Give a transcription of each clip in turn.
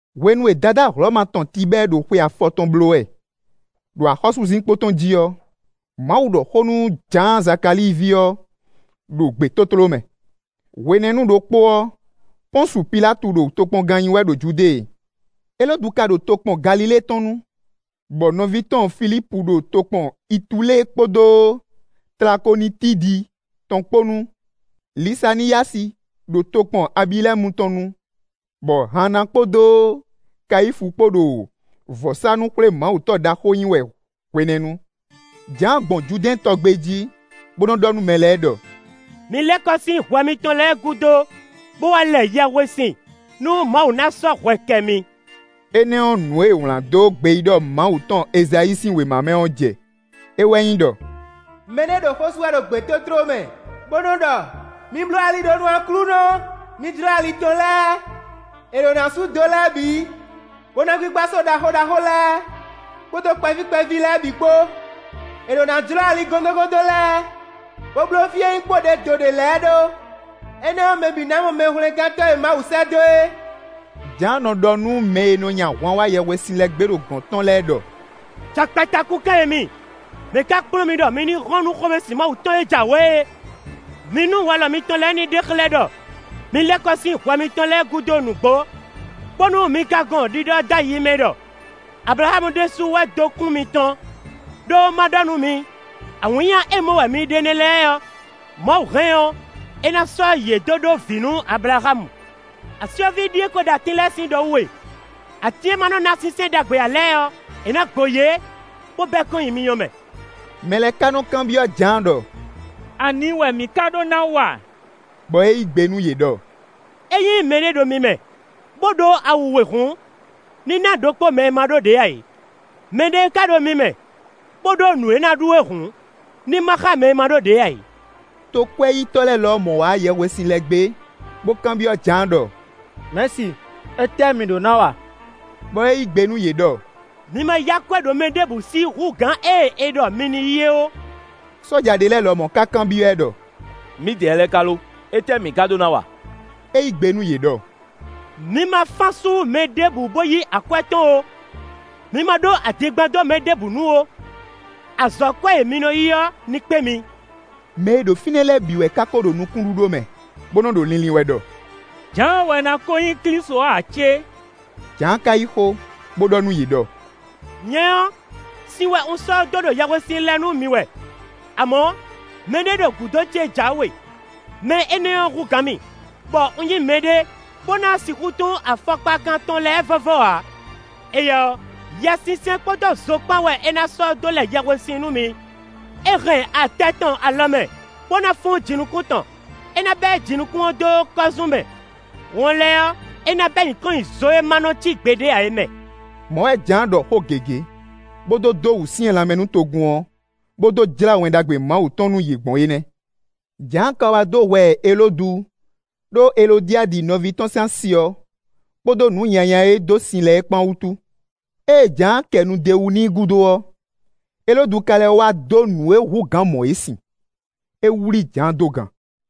Hwenu e Dadá Hlɔ̌ma tɔn Tibɛ́ɛ ɖo xwe afɔtɔn bló wɛ, ɖo axɔ́súzinkpo tɔn jí ɔ́, Mawu ɖɔ xó nú Jǎan Zakalíi ví ɔ́ ɖo gbětótló mɛ. Hwenɛ́nu ɖokpó ɔ́, Pɔ́nsu Pilátu ɖo tokpɔngán nyí wɛ ɖo Judée. Elódu ka ɖo tokpɔn Galilée tɔn nu, bɔ nɔví tɔn Filípu ɖo tokpɔn Itulée kpódó Tlakonitídi tɔn kpó nu; Lisaniyási ɖo tokpɔn Abilɛ́nu tɔn nu, bɔ Hanna kpódó Kayífu kpó ɖo vɔ̌sánú-xwlémawutɔ́ ɖaxó nyí wɛ hwenɛ́nu; Jǎan gbɔn Judɛ́ɛn tɔ gbé jí, bó nɔ́ ɖɔ nú mɛ lɛ́ɛ ɖɔ: “Mi lɛ́ kɔ sín hwɛ mitɔn lɛ́ɛ gúdo, bó wá lɛ yɛhwesin, nú Mawu ná sɔ́ hwɛ kɛ mi.” Énɛ́ ɔ́, nǔ e è wlǎn dó gbeyíɖɔ Mawu tɔn Ezayíi sín wěma mɛ ɔ́ jɛ; é wɛ nyí ɖɔ: “Mɛ ɖé ɖo xó sú wɛ ɖo gbětótló mɛ bó nɔ́ ɖɔ: ‘Mi bló ali ɖó nú Aklúnɔ, mi jlɔ́ ali tɔn lɛ́ɛ! È ɖǒ ná sú do lɛ́ɛ bǐ, bó ná gbígbá só ɖaxó ɖaxó lɛ́ɛ kpódó kpɛví kpɛví lɛ́ɛ bǐ kpó. È ɖǒ ná jlɔ́ ali gɔ́ndɔ́ngɔ́ndɔ́n lɛ́ɛ, bó bló fí e nyí kpóɖědoɖě lɛ́ɛ ɖó. Énɛ́ ɔ́, mɛ bǐ ná mɔ Mɛhwlɛ́ngántɔ́ e Mawu sɛ́ dó é.’” Jǎan nɔ ɖɔ nú mɛ e nɔ nyi ahwan wá yɛhwesin lɛ gbé ɖo gɔ̌n tɔn lɛ́ɛ ɖɔ: “Jakpata kúnkan e mi! Mɛ̌ ká kplɔ́n mi ɖɔ mi ní hɔn nú xomɛsin Mawu tɔn e jǎwe é? Mi nú walɔ mitɔn lɛ́ɛ ní ɖe xlɛ́ ɖɔ mi lɛ́ kɔ sín hwɛ mitɔn lɛ́ɛ gúdo nǔgbó; bónú mi ka gɔn ɖiɖɔ dó ayi mɛ ɖɔ: ‘Ablaxámu ɖésú wɛ dó kún mitɔn.’ Đó má ɖɔ nú mi, awǐnnya e mɔ wɛ mi ɖe nɛ́ lɛ́ɛ ɔ́, Mawu hɛn ɔ́, é ná sɔ́ yě dó ɖó vǐ nú Ablaxámu. Asyɔ́ví ɖíe ko ɖo atín lɛ́ɛ sín ɖɔ wú e; atín e má nɔ́ ná sínsɛ́n ɖagbe ǎ lɛ́ɛ ɔ́, è nǎ gbo yě, bó bɛ́ kɔn nyi myɔ mɛ.” Mɛ lɛ́ɛ ka nɔ kanbyɔ́ Jǎan ɖɔ: “Ani wɛ mǐ ká ɖó ná wa?” Bɔ é yí gbe nú yě ɖɔ: “Ényí mɛɖé ɖo mi mɛ, bó ɖó awu we hǔn, ní ná ɖokpó mɛ e ma ɖó ɖě ǎ é. Mɛ ɖé ká ɖo mi mɛ, bó ɖó nǔ e é ná ɖu é hǔn, ní má xá mɛ e ma ɖó ɖě ǎ é.” Tokwɛ́yítɔ́ lɛ́ɛ lɔmɔ̌ wá yɛhwesin lɛ gbé, bó kanbyɔ́ Jǎan ɖɔ: “Mɛ̌si, étɛ́ mǐ ɖó ná wa?” Bɔ é yí gbe nú yě ɖɔ: “Mi ma yí akwɛ́ ɖo mɛ ɖěbǔ sí hú gǎn ée è ɖɔ mi ní yí é ó.” Sɔ́ja ɖé lɛ́ɛ lɔmɔ̌ ka kanbyɔ́ ɛ ɖɔ: “Mǐdɛɛ lɛ́ɛ ká lo? Étɛ́ mǐ ka ɖó ná wa?” É yí gbe nú yě ɖɔ: “Mi ma fán asú mɛɖé bó yí akwɛ́ tɔn ó; mi ma ɖó adingban dó mɛɖé nu ó; azɔ̌kwɛ́ e mi nɔ yí ɔ́ ní kpé mi.” Mɛ e ɖo fínɛ́ lɛ́ɛ bǐ wɛ ká ko ɖo nukúnɖíɖó mɛ, bó nɔ́ ɖo linlin wɛ ɖɔ: “Jǎan wɛ ná kó nyí Klísu ɔ́ ǎ cé?” Jǎan ka yí xó, bó ɖɔ nú yě ɖɔ: “Nyɛ ɔ́, sin wɛ un sɔ́ dó ɖo yɛhwesin lɛ nú mi wɛ; amɔ̌, mɛɖé ɖo gǔdo ce jǎwe; mɛ énɛ́ ɔ́ hú gǎn mì, bɔ un nyí mɛɖé, bó ná sixú tún afɔkpakan tɔn lɛ́ɛ vɔ́vɔ́ ǎ; éyɛ́ ɔ́, Yɛsinsɛn kpódó zo kpán wɛ é ná sɔ́ dó lɛ yɛhwesin nú mi. É hɛn atɛ tɔn alɔ mɛ, bó ná fún jinukún tɔn. É ná bɛ́ jinukún ɔ́ dó kɔ́zún mɛ; wɔn lɛ́ɛ ɔ́, é ná bɛ́ yě kɔn nyi zo e ma nɔ cí gbeɖé ǎ é mɛ.” Mɔ̌ wɛ Jǎan ɖɔ xó gěgé, bó dó dó wǔsyɛ́n lanmɛ nú togun ɔ́, bó dó jlá Wɛn Ɖagbe Mawu tɔn nú yě gbɔn é nɛ́. Jǎan ka wá dó hwɛ Elódu ɖó Elodiadi nɔví tɔn sín asi ɔ́ kpódó nǔ nyanya e é dó sin lɛ́ɛ kpán wútu. Ée Jǎan kɛ nu d'é wú n'i gúdo ɔ́, Elódu ka lɛ́ wá dó nǔ e hú gǎn mɔ̌ é sin: é wlí Jǎan dó gan.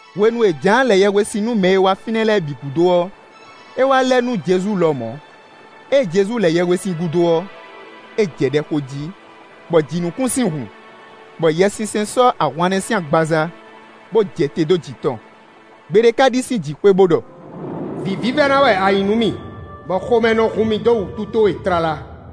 Hwenu e Jǎan lɛ yɛhwesin nú mɛ e wá fínɛ́ lɛ́ɛ bǐ gúdo ɔ́, é wá lɛ nú Jezu lɔmɔ̌. Ée Jezu lɛ yɛhwesin gúdo ɔ́, é jɛ ɖɛ xo jí, bɔ jǐnukúnsin hun, bɔ Yɛsinsɛn sɔ́ ahwannɛ́ sín agbaza, bó jɛ te dó jǐ tɔn. Gbe ɖé ká ɖi sín jǐxwé, bó ɖɔ: “Vǐ vívɛ́ná wɛ a nyǐ nú mì, bɔ xomɛ nɔ hun mì dó wútu towe tlala.”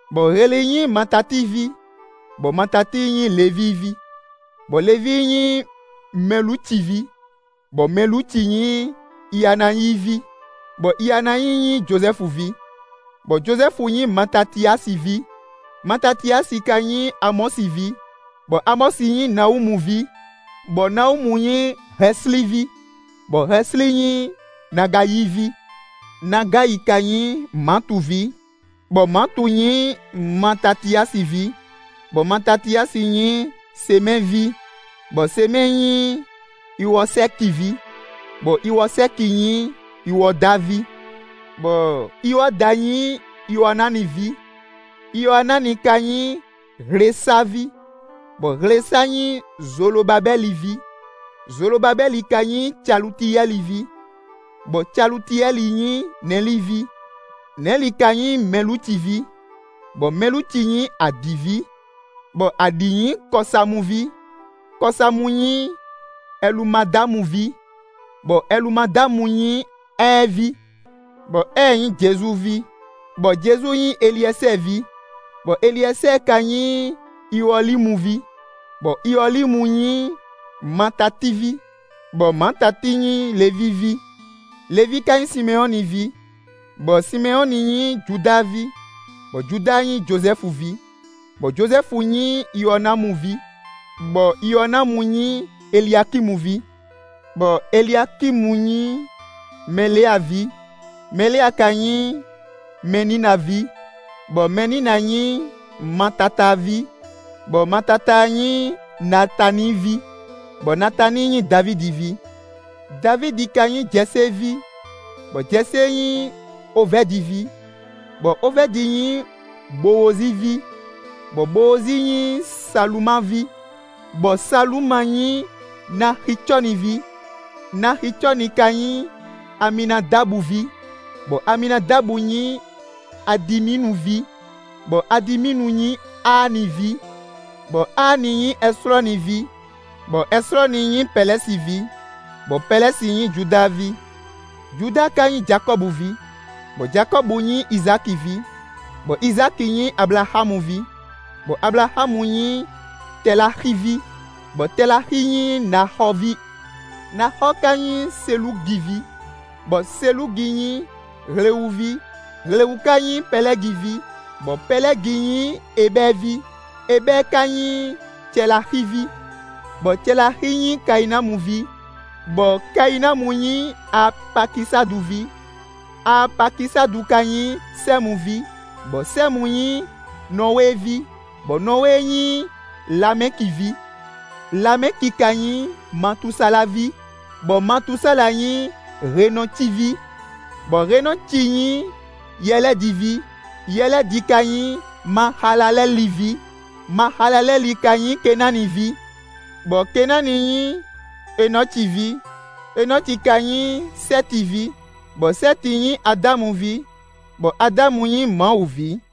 bɔ Heli nyí Matati ví, bɔ Matati nyí Levíi ví, bɔ Levíi nyí Mɛluci ví, bɔ Mɛluci nyí Ianáyi ví, bɔ Ianáyi nyí Jozɛ́fu ví, bɔ Jozɛ́fu nyí Matatiyási ví, Matatiyási ka nyí Amɔ́si ví, bɔ Amɔ́si nyí Nawúmu ví, bɔ Nawúmu nyí Hɛslí ví, bɔ Hɛslí nyí Nagayi ví, Nagayi ka nyí Maatu ví, bɔ Maatu nyí Matatiyási ví, bɔ Matatiyási nyí Semɛ́ɛ ví, bɔ Semɛ́ɛ nyí Iwɔsɛ́ki ví, bɔ Iwɔsɛ́ki nyí Iwɔda ví, bɔ Iwɔda nyí Iwɔanáni ví, Iwɔanáni ka nyí Hlesa ví, bɔ Hlesa nyí Zolobabɛ́li ví, Zolobabɛ́li ka nyí Calutiyɛ́li ví, bɔ Calutiyɛ́li nyí Nɛli ví, Nɛli ka nyí Mɛluci ví, bɔ Mɛluci nyí Adi ví, bɔ Adi nyí Kɔsamu ví, Kɔsamu nyí Ɛlumadámu ví, bɔ Ɛlumadámu nyí Ɛ́ɛ ví, Bɔ Ɛ́ɛ nyí Jezu ví, bɔ Jezu nyí Eliɛsɛ́ɛ ví, bɔ Eliɛsɛ́ɛ ka nyí Iwɔlímu ví, bɔ Iwɔlímu nyí Matati ví, bɔ Matati nyí Levíi ví, Levíi ka nyí Simɛnyɔ́ni ví, bɔ Simɛnyɔ́ni nyí Judáa ví, bɔ Judáa nyí Jozɛ́fu ví, bɔ Jozɛ́fu nyí Iwɔnámu ví, bɔ Iwɔnámu nyí Eliakímu ví, bɔ Eliakímu nyí Mɛlea ví, Mɛlea ka nyí Mɛnína ví, bɔ Mɛnína nyí Matatáa ví, bɔ Matatáa nyí Natáni ví, bɔ Natáni nyí Davídi ví. Davídi ka nyí Jɛsée ví, bɔ Jɛsée nyí Ovɛ́di ví, bɔ Ovɛ́di nyí Bowozi ví, bɔ Bowozi nyí Saluma ví, bɔ Saluma nyí Naxicɔ́ni ví, Naxicɔ́ni ka nyí Aminadabu ví, bɔ Aminadabu nyí Adiminu ví, bɔ Adiminu nyí Aani ví, bɔ Aani nyí Ɛslɔ́ni ví, bɔ Ɛslɔ́ni nyí Pɛlɛ́si ví, bɔ Pɛlɛ́si nyí Judáa ví, Judáa ka nyí Jakɔ́bu ví, bɔ Jakɔ́bu nyí Izáki ví, bɔ Izáki nyí Ablaxámu ví, bɔ Ablaxámu nyí Tɛláxi ví, bɔ Tɛláxi nyí Naxɔ́ɔ ví, Naxɔ́ɔ ka nyí Selúgi ví, bɔ Selúgi nyí Hlewu ví, Hlewu ka nyí Pɛlɛ́gi ví, bɔ Pɛlɛ́gi nyí Ebɛ́ɛ ví, Ebɛ́ɛ ka nyí Cɛláxi ví, bɔ Cɛláxi nyí Kayinamu ví, bɔ Kayinamu nyí Aapakisadu ví, Aapakisadu ka nyí Sɛ́mu ví, bɔ Sɛ́mu nyí Nɔwée ví, bɔ Nɔwée nyí Lamɛki ví, Lamɛki ka nyí Matusala ví, bɔ Matusala nyí Henɔci ví, bɔ Henɔci nyí Yɛlɛ́di ví, Yɛlɛ́di ka nyí Maxalalɛ́li ví; Maxalalɛ́li ka nyí Kenáni ví, bɔ Kenáni nyí Enɔci ví, Enɔci ka nyí Sɛ́ti ví, bɔ Sɛ́ti nyí Adámu ví, bɔ Adámu nyí Mawu ví.